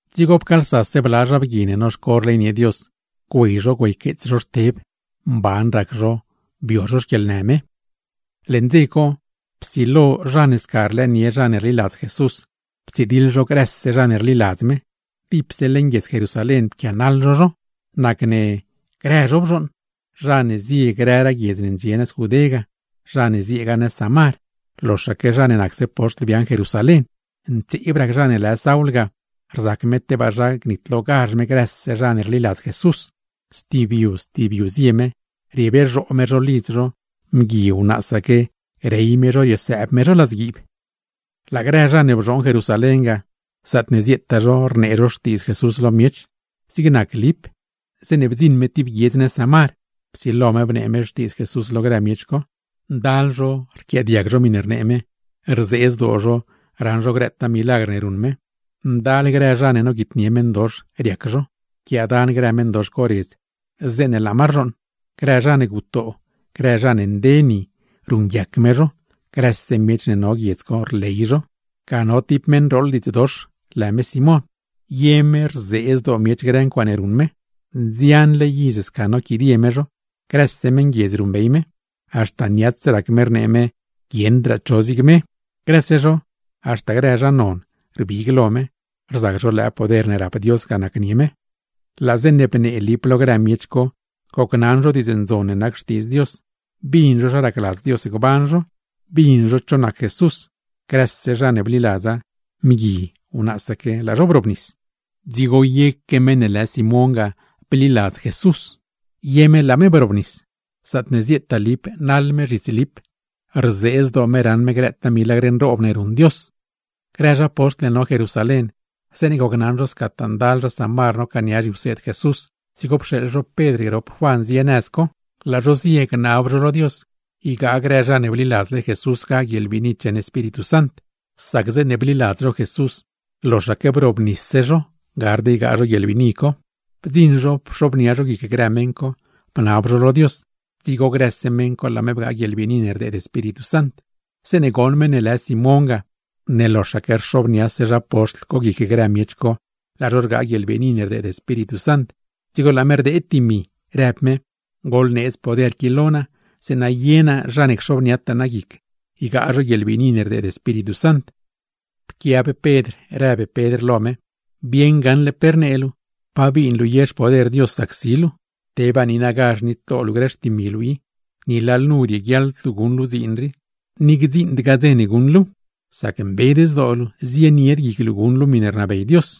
Dzigo pcaalsase bla zha bgui ne noxco rleynie Dios, güey zho güeyqueets zho Xteb; mban rac zho, bio zho xquieḻnë me. Leṉ dze co, psilo zha ne sca rlëënie zha ne rliladz Jesús, ptsidiḻ zho grëse zha ne rliladz me; dipse leṉ guiedz Jerusalén pquianaḻ zho zho. Grëse zho bzhooṉ, zha ne zie grëraa guiedz ne ndxie nëz Judé ga, zha ne zieegaa nëz Samar; loxaque zha ne nacse poxtl biaaṉ Jerusalén. Ntseeb rac Saul, rzac me tebaa zha gnitlogazh me grëse zha ne rliladz Jesús. Stib yu stib yu zie me, riebezhoo me zho lidz zho, mgui wnaasaque rey me riesëëb me zho ladzguiib. Laa grë zha ne bzhooṉ Jerusalén ga, zaatne zieetaa zho rnee zho Xtiidz Jesús lo miech. Zig nac Lip, zeeṉe bdziṉ me tib guiedz nëz Samar, psilo me bnee me Xtiidz Jesús lo grë miech co. Ndal zho rquiaadiag miṉe rnee me, rzee zdoo zho raṉ zho grëtaa milagr ne ruṉ me. Ndal grë zha ne noguitnie meṉdox, riac zho, rquiaadan grë meṉdox co redz zeeṉe laa ma rzhooṉ; grë zha ne gutoo, grë zha ne nde ni, ruṉguiac me zho. Grëse miech ne no guiedz co, rley zho. Ga no tib meṉ ne rooḻ diidz dox, lë Simón. Ye me rzee zdoo miech grë ncuaaṉe ruṉ me. Nzianle iz sca noquidie me zho, grëse meṉguiedz ruṉbey me, haxta niats rac me rnee me guieṉdraa cho zig me. Grëse zho, haxta grë zha non rbig lo me, rzac zho lëë poder ne rap Dios ga nacnie me. Laa zeeṉe bnee Lip lo grë miech co gocnaṉ zho diidz ndzon ne nac Xtiidz Dios, bin zho zha racladz Dios gban zho, bin zho cho nac Jesús; grëse zha ne bliladza, mgui wnaasaque, laa zho brobnis. Dzigo yeque meṉ ne lë Simón ga bliladz Jesús, ye me laa me brobnis; zaatne zieetaa Lip naḻ me zhits Lip, rzee zdoo me raṉ me grëtaa milagr nroob ne ruṉ Dios. Grë zha poxtl ne no Jerusalén, zeeṉe gocnaṉ zho scataa ndal zha Samar nocaania zhiwseed Jesús, dzigo pxeeḻ zho Pedr grop Juan zie nëz co. Laa zho zie gnab zho lo Dios ygaa grë zha ne bliladzle Jesús ga guieḻbiini cheṉ Espíritu Sant; sac zeeṉe bliladz zho Jesús, loxaque brobnisse zho, gard ygaa zho guieḻbiini co. Bdziṉ zho pxobnia zho guic grë meṉ co, bnab zho lo Dios; dzigo grëse meṉ co laa me bgaa guieḻbiini ne rdeed Espíritu Sant. Zeeṉe goṉ meṉ ne lë Simón ga, ne loxaque rxobniase zha poxtl co guic grë miech co laa zho rgaa guieḻbiini ne rdeed Espíritu Sant, dzigo laa me rdeed dimi, rëb me: ―Goḻneedz poder qui lo naa; zeeṉa ye naa zha ne cxobniataa naa guic ygaa zho guieḻbiini ne rdeed Espíritu Sant. Pquiab Pedr rëb Pedr lo me: ―¡Bieṉ gaṉle pe rnee luu! ¿Pa bin luu ye xpoder Dios zac si miech? ¡Tebaa niinagazh nitlo luu grë xtimi luu i! Ni lalnu rieguiaḻd luu guṉ luu dziin rii, ni gdziṉdgaa dze guṉ luuw; sac mbed zdoo luu, zienied guic luu guṉ luu miṉe rnabey Dios.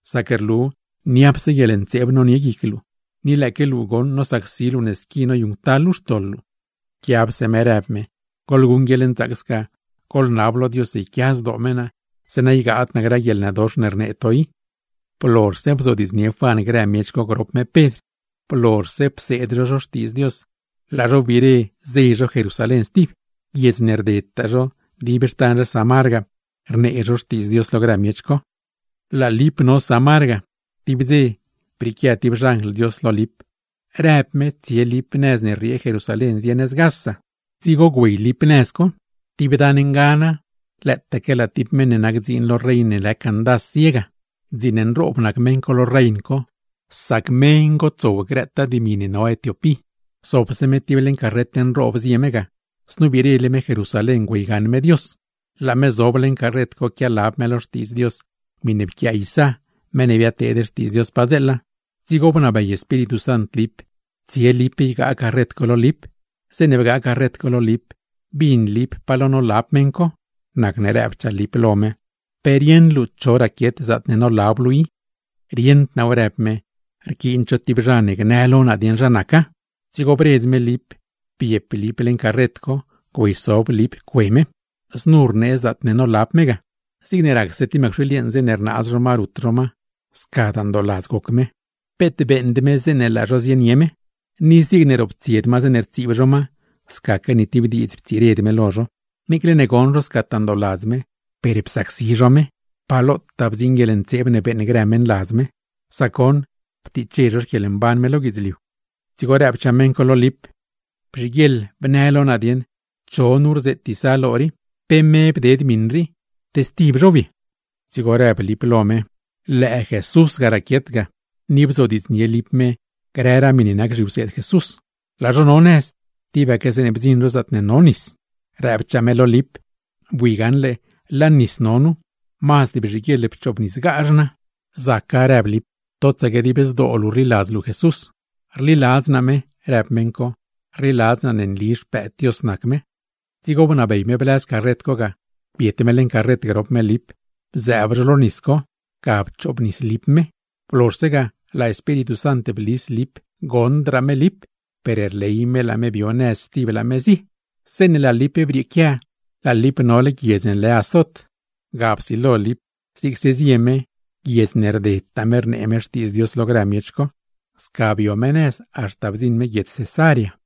sac rlu niapse guieḻntseeb nonie guic luu, ni lëëque luu goṉ nosacsi luu ne squitaa noyuṉctal luu xtoḻ luu. Pquiabse me rëb me: ―Goḻguṉ guieḻnzaac, goḻnab lo Dios yquia zdoo me naa, zeeṉa ygaad naa grë guieḻnëdox ne rnee to i. Blozhse bzodiidznie Juan grë miech co grop me Pedr, blozhse pseed zho zho Xtiidz Dios, laa zho wbire zey zho Jerusalén stib. Guiedz ne rdedtaa zho dib xtan zha Samar ga, rnee zho Xtiidz Dios lo grë miech co. Laa Lip no Samar ga, tib dze brieequia tib xanjl Dios lo Lip, rëb me tsie Lip nëz ne rriee Jerusalén zie nëz Gaza. Dzigo güey Lip nëz co. Tib dan ngana, lëëtaque laa tib meṉ ne nac dziin lo rein ne lë Candás zie ga, dziin nroob nac me lo rein co, sac me ngotsow grëtaa dimi ne no Etiopí. Zobse me tib leṉ carret nroob zie me ga; znu wbirele me Jerusalén güeygaṉ me Dios. Laa me zob leeṉ co quialab me lo Xtiidz Dios miṉe pquiaa Isá, meṉ ne biadteed xtiidz Dios padzeela. Dzigo bnabey Espíritu Sant Lip tsie Lip ygaa carret co lo Lip. Zeeṉe bgaa carret co lo Lip, bin Lip pa lo nolab meṉ co; nacne rëbchaa Lip lo me: ―¿Pe rieṉ luu cho raquiet zaatne nolab luu i? ―Rieṉd naaw ―rëb me―, rquiin tib zha ne gnë lo naa dieṉ zha naca. Dzigo bredz me Lip biep Lip leṉ carret co, güeysob Lip cue me. Znu rnee zaatne nolab me ga: Zigne racse mëcwxiil yeeṉ zeeṉe rnaaz zho ma rut zho ma, scadaa ndooladz goc me, peet beeṉd me zeeṉe laa zho zienie me. Ni zigne roptsied ma zeeṉe rtsiib zho ma, scaque ni tib diidz ptsired me lo zho. Niicle ne goṉ zho scataa ndooladz me, per psacsi zho me. ¡Pa lotaa bdziṉ guieḻntseeb ne beeṉ grë meṉladz me! Sac goṉ, ptiche zho xquieḻmban me lo guidzliu. Dzigo rëbchaa meṉ co lo Lip: ―Bzhiguieḻ bnë lo naa dieṉ, cho nu znu rzeet Isá lo rii. ¿Pe me bded miṉ rii, te stib zhow ye? Dzigo rëb Lip lo me Jesús raquiet ga, ni bnee Lip grëraa miṉe nac zhiwseed Jesús. Laa zho no nëz, tibaque zeeṉe bdziṉ zho tib lugar co no nis; rëbchaa me lo Lip: ―¡Bui gaṉle laa nis no nu! Mazd bzhiguieḻ pchoobnisgazh naa. [―Zaca ―rëb Lip―, totsaque dib zdoo luu rliladz luu Jesús. ―Rliladz naa me ―rëb meṉ co―, rliladz naa ne nli Xpëëd Dios nac me.] Dzigo bnabey me blëz carret co ga. Biet me leeṉ co grop me Lip bzëëb zho lo nis co, ga pchoobnis Lip me. Blozhse ga, laa Espíritu Sant blis Lip goṉdraa me Lip; per rley me laa me bio nëz stib, laa me zie. Zeeṉe laa Lip brieequia, laa Lip nole guiedz ne lë Azot. Ga psilo me zigse zie me, guiedz ne rdedtaa me rnee me Xtiidz Dios lo grë miech co. Sca bio me nëz, haxta bdziṉ me guiedz Cesarea.